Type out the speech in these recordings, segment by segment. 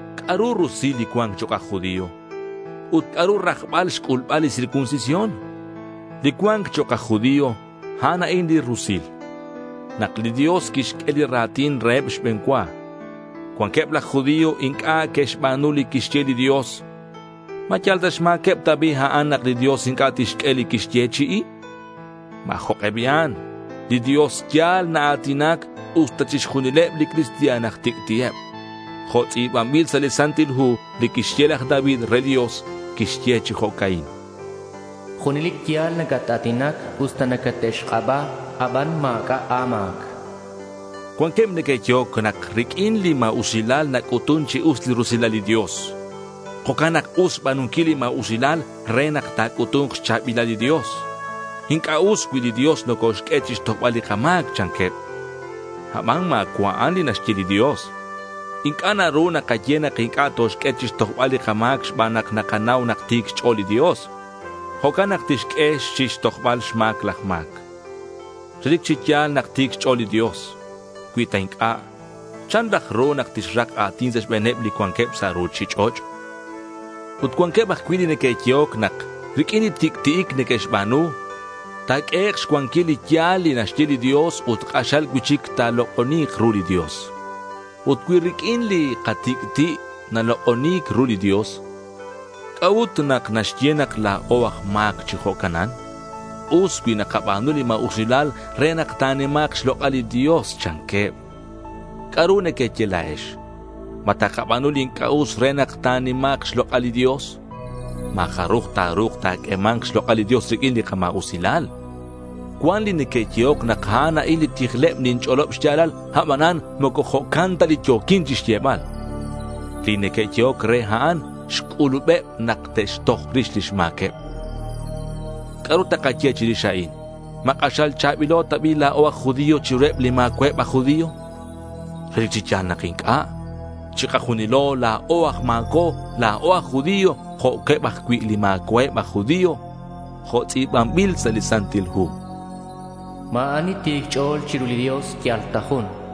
¿C'a'ru rusil li cua̱nc chok' aj judío? Ut, ¿c'a'ru rajbal xc'ulbal li circuncisión? Li cua̱nc chok' aj judío, a'an a'in li rusil: nak li Dios quixq'ue li ra̱tin reheb xbe̱n cua. Cuanqueb laj judío inc'a' que'xba̱nu li quixye li Dios. ¿Ma yal sa' xma̱queb ta bi' a'an nak li Dios inc'a' tixq'ue li quixyechi'i? ¡Ma̱ jok'e bi'an! Li Dios ya̱l naa̱tinac usta chixjunileb li cristian aj tic'ti'eb. Jo' tz'i̱banbil sa' li Santil Hu li quixye laj David re li Dios. Quixye chi jo'ca'in: Junelic ya̱l nacata̱tinac. Usta nacate'xk'aba, aban ma̱c'a' a̱ma̱c. Cuanqueb neque'yehoc nak riq'uin li ma̱usilal nac'utun chi us li rusilal li Dios. Jo'can nak us xba̱nunquil li ma̱usilal re nak ta̱c'utu̱nk xcha̱bilal li Dios. Inc'a' us cui li Dios nocoxq'ue chi xtojbal li kama̱c, chanqueb. Aban ma̱cua' a'an li naxye li Dios. Inc'a' naru nakaye nak inc'a' toxq'ue chixtojbal li kama̱c xban nak nakanau nak ti̱c xch'o̱l li Dios. Jo'can nak tixq'ue chixtojbal xma̱c laj ma̱c. Relic chi ya̱l nak ti̱c xch'o̱l li Dios. Cui ta inc'a', ¿chan raj ru nak tixrak a̱tin sa' xbe̱neb li cuanqueb sa' ruchich'och'? Ut cuanqueb ajcui' li neque'yehoc nak riq'uin li tic'ti'ic neque'xba̱nu, ta̱q'uehek' xcuanquil li ya̱l li naxye li Dios ut k'axal cui'chic ta̱lok'oni̱k ru li Dios. Ut cui riq'uin li katic'ti' nalok'oni̱c ru li Dios, ¿c'a'ut nak naxye nak la̱o aj ma̱c chi jo'canan? Us cui nakaba̱nu li ma̱usilal re nak ta̱nima̱k xlok'al li Dios, chanqueb. ¿C'a'ru nequeye la̱ex? ¿Ma takaba̱nu li inc'a' us re nak ta̱nima̱k xlok'al li Dios? Ma̱ jaruj ta̱ru̱k ta̱q'uema̱nk xlok'al li Dios riq'uin li kama̱usilal. Cuan li neque'yehoc nak a'an a'in li tijleb ninch'olob xya̱lal, abanan moco jo'can ta li yo̱quin chixyebal. Li neque'yehoc re a'an xc'ulubeb nak te'xtoj rix lix ma̱queb. ¿C'a'ru takaye chirix a'in? ¿Ma k'axal cha̱bilo ta bi' la̱o aj judío chiruheb li ma̱cua'eb aj judío? Relic chi ya̱l nak inc'a'. Chikajunilo ban la̱o aj ma̱co, la̱o aj judío jo'queb ajcui' li ma̱cua'eb aj judío. Jo' tz'i̱banbil sa' li Santil Hu: Ma̱ ani ti̱c xch'o̱l chiru li Dios. Yal ta jun.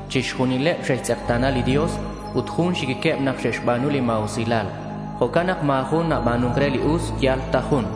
Chixjunileb xe'xtz'ekta̱na li Dios, ut jun xiquiqueb nak xe'xba̱nu li ma̱usilal. Jo'can nak ma̱ jun naba̱nun re li us. Yal ta jun.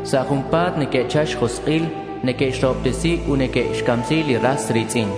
Sa' junpa̱t neque'chal xjosk'il. Neque'xrahobtesi ut neque'xcamsi li ras ri̱tz'in.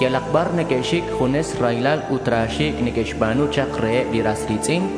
Yalak bar neque'xic junes raylal ut ra xi̱c' neque'xba̱nu chak reheb li ras ri̱tz'in.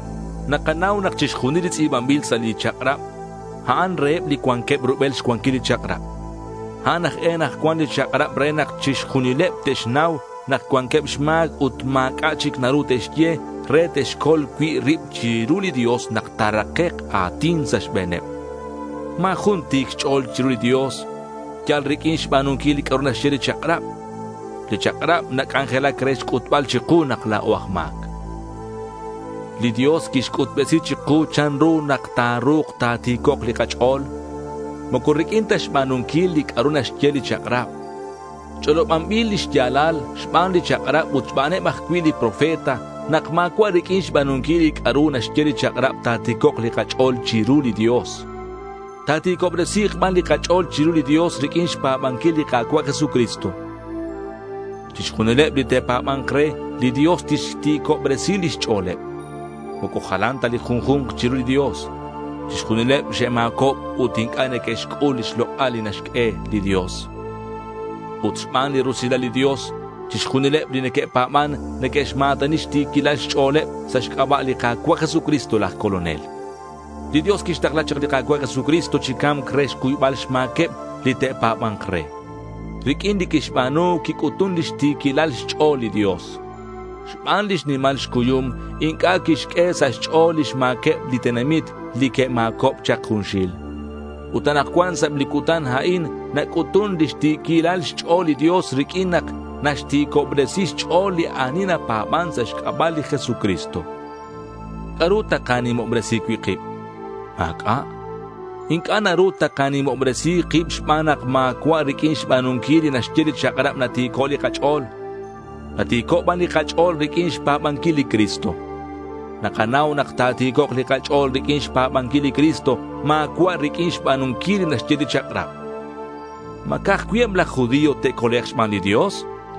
Nakanau nak chixjunil li tz'i̱banbil sa' li chak'rab, a'an reheb li cuanqueb rubel xcuanquil li chak'rab. A'an aj e nak cuan li chak'rab re nak chixjunileb te'xnau nak cuanqueb xma̱c ut ma̱c'a' chic naru te'xye, re te'xcol cui' rib chiru li Dios nak ta̱rakek' a̱tin sa' xbe̱neb. Ma̱ jun ti̱c xch'o̱l chiru li Dios yal riq'uin xba̱nunquil li c'a'ru naxye li chak'rab. Li chak'rab nac'anjelac re xc'utbal chiku nak la̱o aj ma̱c. Li Dios quixc'utbesi chiku chanru nak ta̱ru̱k ta̱ti̱cok' li kach'o̱l. Moco riq'uin ta xba̱nunquil li c'a'ru naxye li chak'rab. Ch'olobanbil li xya̱lal xban li chak'rab ut xbaneb ajcui' li profeta nak ma̱cua' riq'uin xba̱nunquil li c'a'ru naxye li chak'rab ta̱ti̱cok' li kach'o̱l chiru li Dios. Ta̱ti̱cobresi̱k ban li kach'o̱l chiru li Dios riq'uin xpa̱banquil li Ka̱cua' Jesucristo. Chixjunileb li te'pa̱ba̱nk re, li Dios tixti̱cobresi lix ch'o̱leb. Moco jalan ta li junju̱nk chiru li Dios. Chixjunileb xe'ma̱cob ut inc'a' neque'xc'ul li lok'al li naxq'ue li Dios. Ut xban li rusilal li Dios, chixjunileb li neque'pa̱ban, neque'xma̱tani xti̱quilal xch'o̱leb sa' xc'aba' li Ka̱cua' Jesucristo laj Colonel. Li Dios quixtakla chak li Ka̱cua' Jesucristo chi ca̱mc re xcuybal xma̱queb li te'pa̱ba̱nk re. Riq'uin li quixba̱nu quic'utun lix ti̱quilal xch'o̱l li Dios. Xban lix nimal xcuyum, inc'a' quixq'ue sa' xch'o̱l lix ma̱queb li tenamit li que'ma̱cob chak junxil. Ut anakcuan sa' eb li cutan a'in, nac'utun lix ti̱quilal xch'o̱l li Dios riq'uin nak naxti̱cobresi xch'o̱l li ani napa̱ban sa' xc'aba' li Jesucristo. ¿C'a'ru takanimobresi cui' kib? Ma̱c'a'. Inc'a' naru takanimobresi kib xban nak ma̱cua' riq'uin xba̱nunquil li naxye li chak'rab nati̱co' li kach'o̱l. Nati̱co' ban li kach'o̱l riq'uin xpa̱banquil li Cristo. Nakanau nak ta̱ti̱cok' li kach'o̱l riq'uin xpa̱banquil li Cristo. Ma̱cua' riq'uin xba̱nunquil li naxye li chak'rab. ¿Ma ca'aj cui' eb laj judío te'colek' xban li Dios?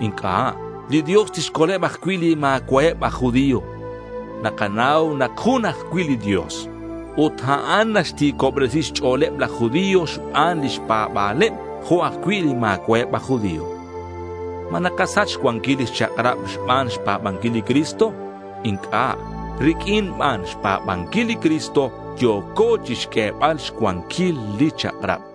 Inc'a'. Li Dios tixcoleb ajcui' li ma̱cua'eb aj judío. Nakanau nak jun ajcui' li Dios. Ut a'an naxti̱cobresi xch'o̱leb laj judío xban lix pa̱ba̱leb jo' ajcui' li ma̱cua'eb aj judío. ¿Ma nakasach xcuanquil li chak'rab xban xpa̱banquil li Cristo? Inc'a'. Riq'uin ban xpa̱banquil li Cristo yo̱co chixq'uebal xcuanquil li chak'rab.